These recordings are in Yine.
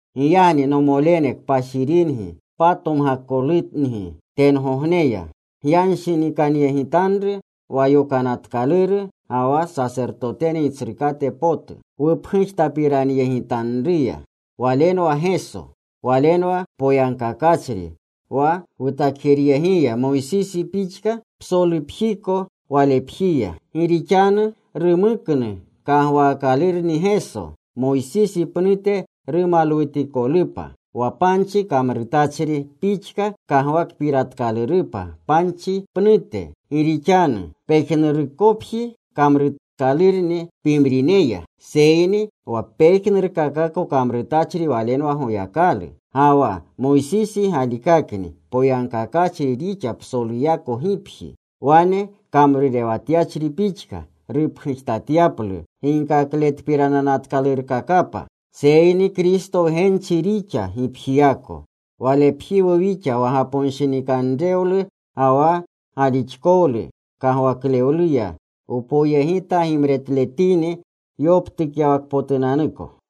Giyagni, nomolene, kpashiringi, patomgakolungi tengogneya, gyanshinikanyegitanru wa yokanatkaluru ga wa sasertotene Gitsrukate potu wupgujtapiranyegitanruya. Walenwa Geso. Walenwa poyagkakachri wa rutakjeryegiya, Moysisi pixka psolupjiko walepjiya. Gi rixanu rumuknu kagwaakalurni Geso Moysisi pnute rumalwutikolupa, wa panchi kamrutachri pixka kagwakpiratkalurupa panchi pnute. Gi rixanu pejnurukopji kamrutkalurni pimrineya. Seyni wa pejnurkakako kamrutachri Walenwa Goyakalu. Ga wa Moysisi galikakni poyagkakachri rixa psoluyako gipji, wane kamrurewatyachri pixka, rupgujtatyaplu ginkakletpiranatkalurkakapa. Seyni Kristo wgenchi rixa gipjiyako. Walepjiwu wixa wa gaponshinikanrewlu ga wa galixkowlu kagwaklewluya wpoyegita gimretletini yoptukyawakpotunanuko.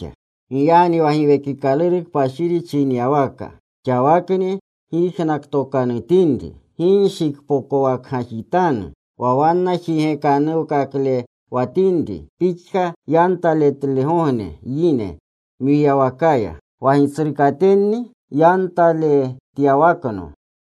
Giyagni wa Giwekikaluru Kpashiri chinyawaka: “Xawakni gyijnaktokanutinri, Gi nshikpokwakgajitanu wa wanna jigekanuwkaklewatinrini pixka yantaletlegogne yine mwiyawakaya. Wa gitsrukatenni yantaletyawakno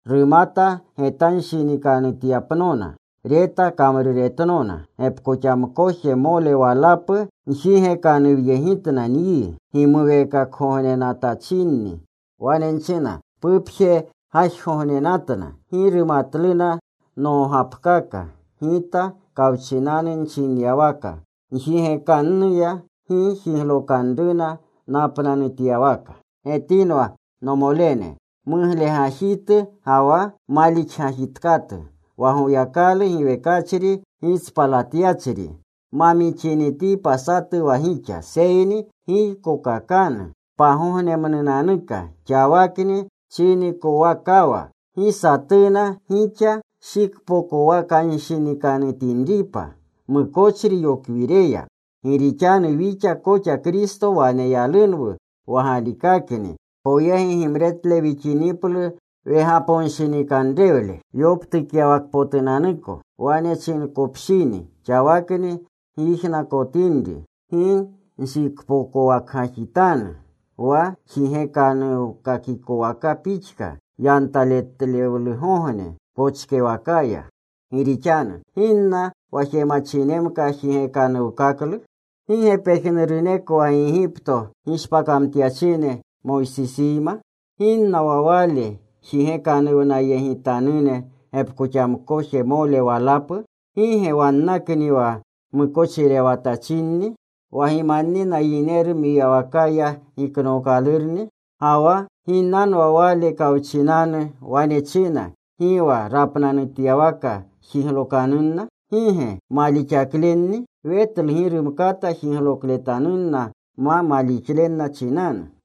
rumata getanshinikanutyapnona. Reta kamruretnona. Gepkoxamkojemole walapu njigekanuwyegitna nyi gimuweekakgognenatachinni. Wane nchina, ‘Pupjegajgognenatna. Gi rumatluna nogapkaka.’ Gita kawchinanu nchinyawaka njigekanuya, ‘Gi jiglokanruna napnanutyawaka.’” Getinwa, nomolene, muglegajitu ga wa malixgajitkatu, wa Goyakalu giwekachri gitspalatyachri ma mixinitipa satu wa gixa. Seyni giykokakanu pagognemnunanuka xawakni chinikowakawa. Gi satuna gixa shikpokwakanshinikanutinripa mukochri yokwireya. Gi rixanu wixa koxa Kristo waneyalunwu wa galikakni poyegi gimretle wixiniplu wegaponshinikanrewle yoptukyawakpotunanuko. Wane chinkopshini: “Xawakni gyijnaktokanutinri, gi nshikpokwakgajitanu wa jigekanuwkakikowaka pixka yantaletlegogne pochkewakaya.” Gi rixanu ¿ginna wa jemachinemka jigekanuwkaklu? ¿Gi ge pejnuruneko wa Gigipto gishpakamtyachine Moysisiyma? ¿Ginna wa Wale jigekanuwnayegitanune gepkoxamkojemole walapu? ¿Gi ge wannakni wa mukochirewatachinni, wa gimannina yineru mwiyawakaya giknookalurni? Ga wa ¿ginnanwa Wale kawchinanu wane china gi wa rapnanutyawaka jiglokanunna? ¿Gi ge malixaklenni? Wetlu gi rumkata jiglokletanunna ma malixlenna chinanu.